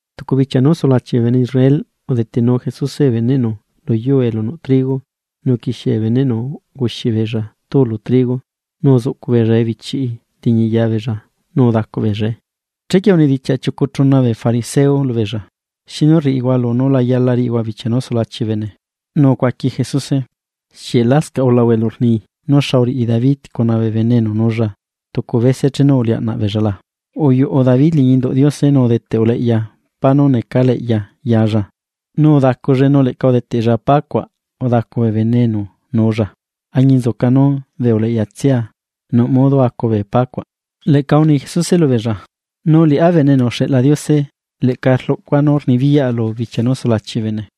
Tucu bichia nú sulachi bee bene Israel udetenu Jesuse bee beneꞌnu lu yuu elu nuꞌ trigo nu uquixie bee beneꞌnu unguxi beella túu lu trigo, nu uzuꞌcu beella ebichiꞌi liñi ya beella nu udacu beellae. Chequie unidichiaꞌ chiucu chuna bee fariseo lubeella: ―¿Xinu rriꞌihua lunú la yala riꞌihua bichia nú sulachi bee bene? Nu ucuaqui Jesuse: ―¿Xieꞌ lascaꞌ ulahua elu rni nú xa uriꞌi David cuna bee bene enu nuulla tucu bese chenu uliaꞌna beella la? Uyuꞌu David liñi induꞌ Diose nu udeteꞌ uleꞌya pá nú necaleꞌya yalla, nu udacullae nu leꞌca udeteꞌlla pá cuaꞌ udacu bee bene enu nuulla, añinzuca nú bee uleꞌyatsia nuꞌ modo acu bee pá cuaꞌ. Leꞌca uni Jesuse lubeella: ―Nu liꞌá Bene enu uxeꞌla Diose, leꞌca rluꞌcua nú rnibiyaꞌa lu bichia nú sulachi bee bene.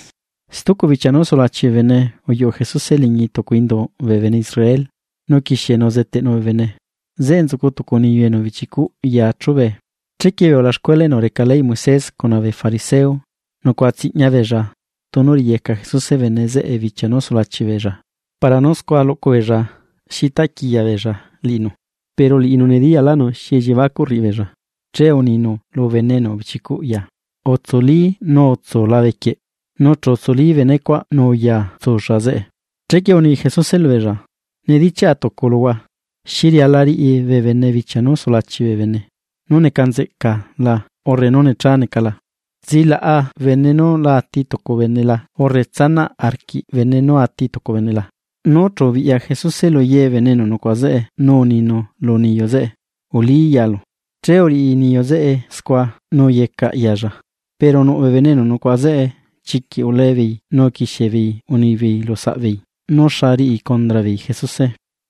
Stucu bichia nú sulachi bee bene uyuꞌu Jesuse liñi tucu induꞌ bee bene Israel, nu uquixienu uzeteꞌnu bee bene. Zeꞌe nzucu tucu niyu enu ubichi cuꞌ ya chubee. Chequie bee ulaxcuela enu reca leyꞌ Moisés cuna bee fariseo, nucuaꞌa tsiꞌña beella tunu riꞌiyeca Jesuse bene zeꞌe bichia nú sulachi beella, para nú scua luꞌcu beella xa ricuꞌ quiya beella liꞌinu. Pero liꞌinu nediyaꞌlaꞌnu xi elliebacuꞌ rriꞌi beella, che uninu lu bene enu ubichicuꞌ ya: ―Utsuli nu utsu labe quieꞌ. Nu chu utsuli bene cuaꞌ nu uya tsulla zeꞌe. Chequie uni Jesuse lubeella: ―Nidichiaꞌa tucu luhua: ¿Xi riala riꞌi bee bene bichia nú sulachi bee bene? ¿Nú neca nzeꞌca la urre nú necha neca la? ¿Tsilaꞌa bene nú la ati tucu bene la urre tsanaꞌ arquiꞌ bene nú ati tucu bene la? Nú chu ubiꞌya Jesuse lu ye bee bene enu nucuaꞌa zeꞌe nu uninu lu niyu zeꞌe: ―Ulí yalu. Che uriꞌi niyu zeꞌe scua nu uyecaꞌ yaalla. Pero nuꞌ bee bene enu nucuaꞌa zeꞌe, chiquiꞌ ulee beei nu uquixie beei unibeei lu saꞌ beei nú xa riꞌi condra beei Jesuse.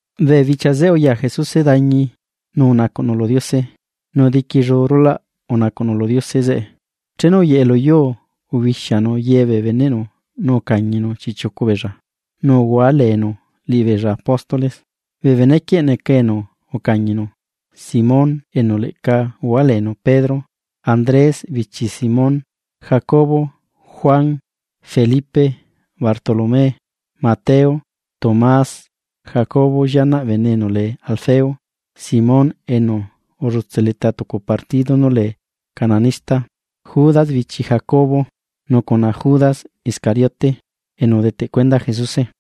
Bee bichia zeꞌe uya Jesuse dañi nu unacuꞌnu lu Diose, nu diquillu rulaꞌ unacuꞌnu lu Diose zeꞌe. Chenu uyeꞌe lu yuu ubixianu ye bee beneꞌnu nu ucañinu chiꞌchiucu beella, nu uhua leenu liꞌibeella apóstoles. Bee benequieꞌ neca enu ucañinu: Simón enu leꞌca uhualeenu Pedro, Andrés bichi Simón, Jacobo, Juan, Felipe, Bartolomé, Mateo, Tomás, Jacobo llianaꞌ bene enu lee Alfeo; Simón enu ullutse leta tucu partido nu lee cananista; Judas bichi Jacobo; nu cuna Judas Iscariote, enu udeteꞌ cuenda Jesuse.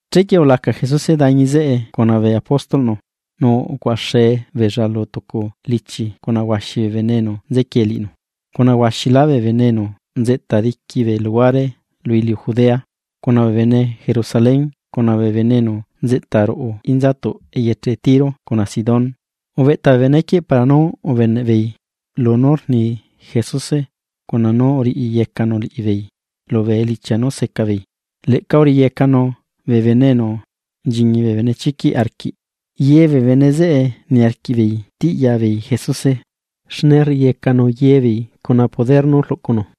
Chequie ulaca Jesuse dañi zeꞌe cuna bee apóstolꞌnu nu ucuaꞌaxe beella lu tucu lichi cuna huaxi bee bene enu nzequie liꞌinu; cuna huaxilá bee bene enu nzeꞌta diqui bee luhuare lu iliu Judea, cuna bee bene Jerusalén cuna bee bene enu nzeꞌta ruꞌu inzatuꞌ eyeche Tiro cuna Sidón. Ubeꞌta bee benequieꞌ para nú ubeneꞌ beei lunú rni Jesuse cuna nú uriꞌiyecanu liꞌibeei lubee elichia nú seca beei. Leꞌca uriꞌiyecanu bee bene enu nchiñi bee benechiquiꞌ arquiꞌ. Ye bee bene zeꞌe niarquiꞌ beei tiꞌya beei Jesuse, xne rriꞌiyecanu ye beei cuna poder nú rluꞌcunu.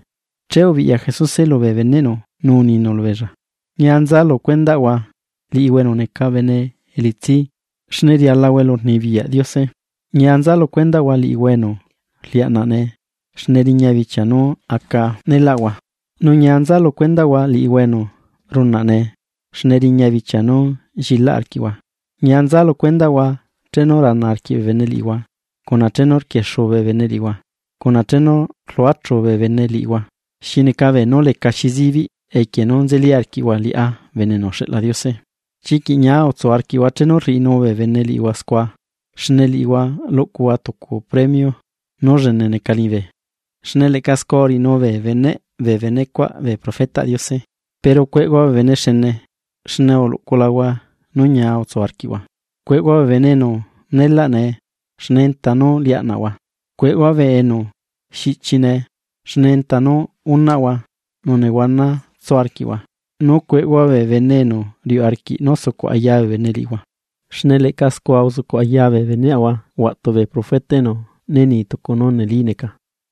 Che ubiꞌya Jesuse lubee beneꞌnu nu uninu lubeella: ―Ñia nza lu cuendaꞌhua liꞌihua enu neca bene elitsi, xne rialahua elurnibiyaꞌ Diose. ’Ñia nza lu cuendaꞌhua liꞌihua enu rliaꞌnaꞌ nee, xne riña bichia nú aca neelaꞌhua, nu ñia nza lu cuendaꞌhua liꞌihua enu runaꞌ nee, xne riña bichia nú llilaꞌ arquiꞌhua. ’Ñia nza lu cuendaꞌhua chenu rana arquiꞌ bee bene liꞌihua, cuna chenu rtiliacaꞌ bee bene liꞌihua cuna chenu rquiexuu bee bene liꞌihua, cuna chenu rluachú bee bene liꞌihua xi neca beenú lecaxi zibiꞌ equie nú nzeli arquiꞌhua liꞌá Bene enu uxeꞌla Diose. Chiquiꞌ ñia utsu arquiꞌhua chenu rriꞌinu bee bene liꞌihua scua, xne liꞌihua luꞌcuhua tucu premio nú llene neca liñibe, xne leꞌca scua uriꞌinú bee beneꞌ bee benecuaꞌ bee profetaꞌ Diose. ’Pero cueꞌhua bee bene xene, xne uluꞌculahua nú ñia utsu arquiꞌhua. ’Cueꞌhua bee bene enu neelaꞌ nee, xne enta nú liaꞌnaꞌhua. Cueꞌhua bee enu xiꞌchi nee, xne enta nú unaꞌhua nu nehuana tsu arquiꞌhua. ’Nu cueꞌhua bee bene enu riuꞌ arquiꞌ nú sucuꞌ aya bee bene liꞌihua, xne leꞌca scua uzucuꞌ aya bee beneꞌahua huaꞌtu bee profeta enu né ni tucu nú neli neca.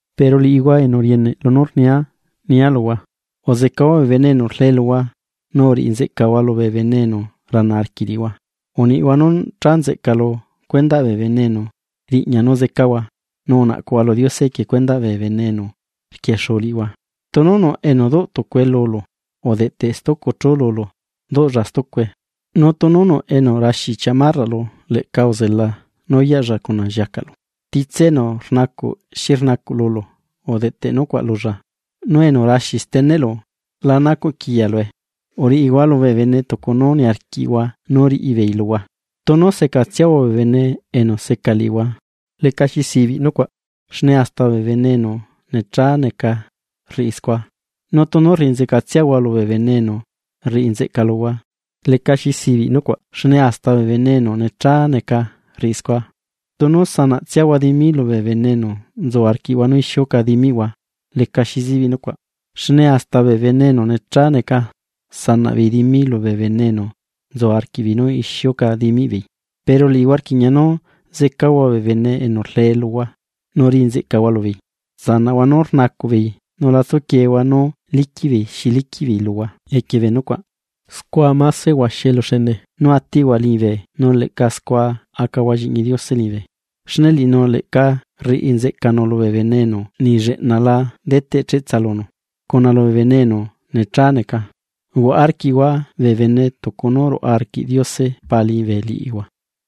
’Pero liꞌihua enu rieneꞌ lunú rnia, nia luhua: Uzecahua bee bene enu rlee luhua, nu uriꞌi nzeꞌcahua lubee bene enu rana arquiꞌ liꞌihua, uniꞌhua nú cha nzeꞌca lu cuendaꞌ bee bene enu riꞌña nú zecahua, nu unaꞌcuhua lu Diose equie cuendaꞌ bee bene enu rquiexuu liꞌihua. Tunu nuꞌ enu duꞌ tucue lulu, udeꞌteꞌ stucu chú lulu duꞌlla stucue, nu tunu nuꞌ enu raxi chamarraꞌlu leꞌca utsanaꞌ nú uyaꞌlla cuna lliacaꞌlu. Titse enu rnacuꞌ xi rnacuꞌ lulu udeꞌteꞌ nucuaꞌ lulla, nu enu raxi steneꞌlu la nacuꞌ quiyalue. Uriꞌihua lubee bene tucu nú niarquiꞌhua nú riꞌi beei luhua. ’Tunu secatsiahua bee bene enu seca liꞌihua, lecaxi sibiꞌ nucuaꞌ, xne hasta bee bene enu necha neca rriꞌi scua. Nu tunu rriꞌi nzeꞌcatsiahua lubee bene enu rriꞌi nzeꞌca luhua, lecaxi sibiꞌ nucuaꞌ xne hasta bee bene enu necha neca rriꞌi scua. Tunu sanaꞌtsiahua dimi lubee bene enu nzu arquiꞌhua nú ixiuca dimiꞌhua lecaxi zibiꞌ nucuaꞌ. Xne hasta bee bene enu necha neca sanaꞌ beei dimi lubee bene enu nzu arquiꞌbeei nú ixiuca dimiꞌ beei. Pero liꞌihua rquiꞌña nú zecahua bee bene enu rlee luhua, nu riꞌi nzeꞌcahua lubeei. Tsanaꞌhua nú rnacuꞌ beei nu la tsuquiehua nú liquiꞌ beei xi liquiꞌ beei luhua equie bee nucuaꞌ. Scua máse huaxi eluxene nú atiꞌhua liñibe nu leꞌca scua acahua lliꞌñi Diose liñibe, xne liꞌinu leꞌca rriꞌi nzeꞌcanu lubee bene enu niꞌ lleꞌna la deteꞌ cheꞌtsa lunu, cuna lubee bene enu necha neca. Uhuaꞌa arquiꞌhua bee bene tucu nú ruaꞌa arquiꞌ Diose Pa liñibe liꞌihua.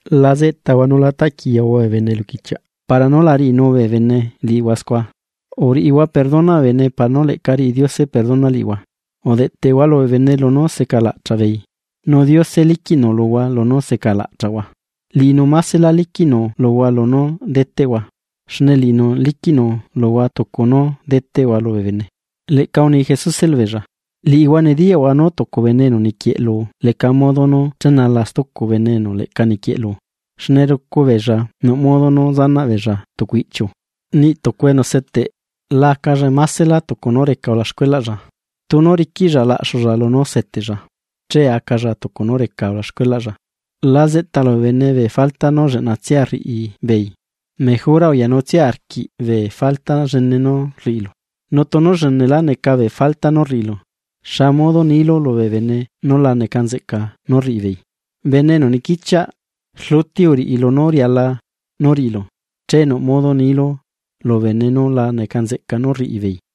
’La zeꞌtahua nu la taꞌquiyahua bee bene eluquichiaꞌ para nú la riꞌinu bee bene liꞌihua scua. Uriꞌihua perdona bee bene para nú leꞌca riꞌi Diose perdona liꞌihua. Udeꞌteꞌhua lubee bene lunú secalaꞌchaꞌ beei, nu Diose liquiꞌnu luhua lunú secalaꞌchaꞌhua. Liꞌinu másela liquiꞌnu luhua lunú deteꞌhua. Xne liꞌinu liquiꞌnu luhua tucu nú deteꞌhua lubee bene. Leꞌca uni Jesuse lubeella: ―Liꞌihua nediyaꞌhua nú tucu bene enu niquieꞌlu leca modo nú chenala stucu bene enu leꞌca niquieꞌlu, xne rucu beella nuꞌ modo nú zanaꞌ beella tucu ichiu. Niꞌ tucu enu seteꞌ la acalla másela tucu nú reca ulaxcuelaꞌlla, tunu riquiꞌlla laꞌxulla lunú seteꞌlla, che acalla tucu nú reca ulaxcuelaꞌlla. ’La zeꞌtalu bee bene bee falta nú lleꞌnatsia nú rriꞌi beei, mejora uyanutsia arquiꞌ bee falta llene nú rriꞌilu. Nu tunu llenelá neca bee falta nú rriꞌilu, ¿xa modo nilu lu bene nú la neca nzeꞌca nú rriꞌibeei? ¡Bene enu niquichiaꞌ! Rluti uriꞌi lunú riala nú riꞌilu, che nuꞌ modo nilu lu bene nú la neca nzeꞌca nú rriꞌibeei.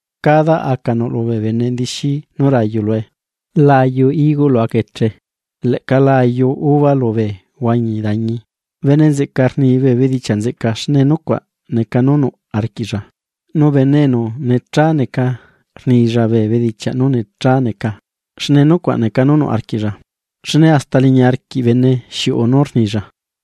Cada aca nuꞌlu bee bene ndixi nú rayu lue. La ayu higo lu aca eche, leꞌca la ayu uva lubee huañi dañi. Bene nzeꞌca rni bee bedichiaꞌ nzeꞌca, xne nucuaꞌ neca nú nuꞌ arquiꞌlla, nu bene enu necha neca rnilla bee bedichiaꞌ nú necha neca. Xne nucuaꞌ neca nú nuꞌ arquiꞌlla. Xne hasta liñi arquiꞌ bene xiuꞌu nú rnilla.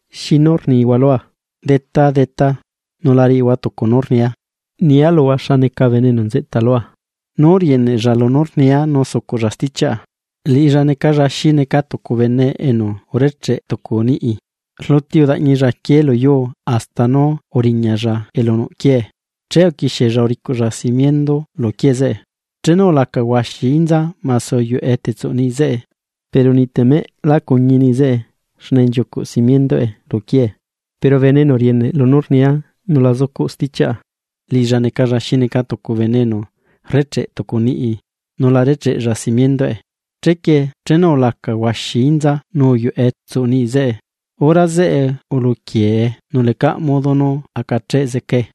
’¿Xinu rnihua lua, “Detá, Detá” nu la riꞌihua tucu nú rnia? Nia luhua xa neca bene enu nzeꞌta lua, nú rieneꞌlla lunú rnia, nu sucuꞌlla stichiaꞌa: Liꞌilla necalla xi neca tucu bene enu urecheꞌe tucu niꞌi. Rluti udaꞌñilla aquié lu yuu hasta nú uriñalla elu nuꞌ quiee, che uquixiella uricuꞌlla simiendu lu quiee zeꞌe. Chenu ulaca huaxi inza mase uyuꞌe tsuꞌ niꞌi zeꞌe, pero niꞌ temeꞌ lá cuñi niꞌi zeꞌe, xne nchiucuꞌ simienduꞌe lu quiee. Pero bene enu rieneꞌ lunú rnia nu la zucuꞌlla stichiaꞌa, liꞌilla necalla xi neca tucu bene enu rrecheꞌ tucu niꞌi nu la recheꞌlla simienduꞌe. Chequie chenu ulaca huaxi inza nu uyuꞌe tsuꞌ niꞌi zeꞌe, hora zeꞌe uluquiee nu lecaꞌ modo nú acacheꞌ zecae.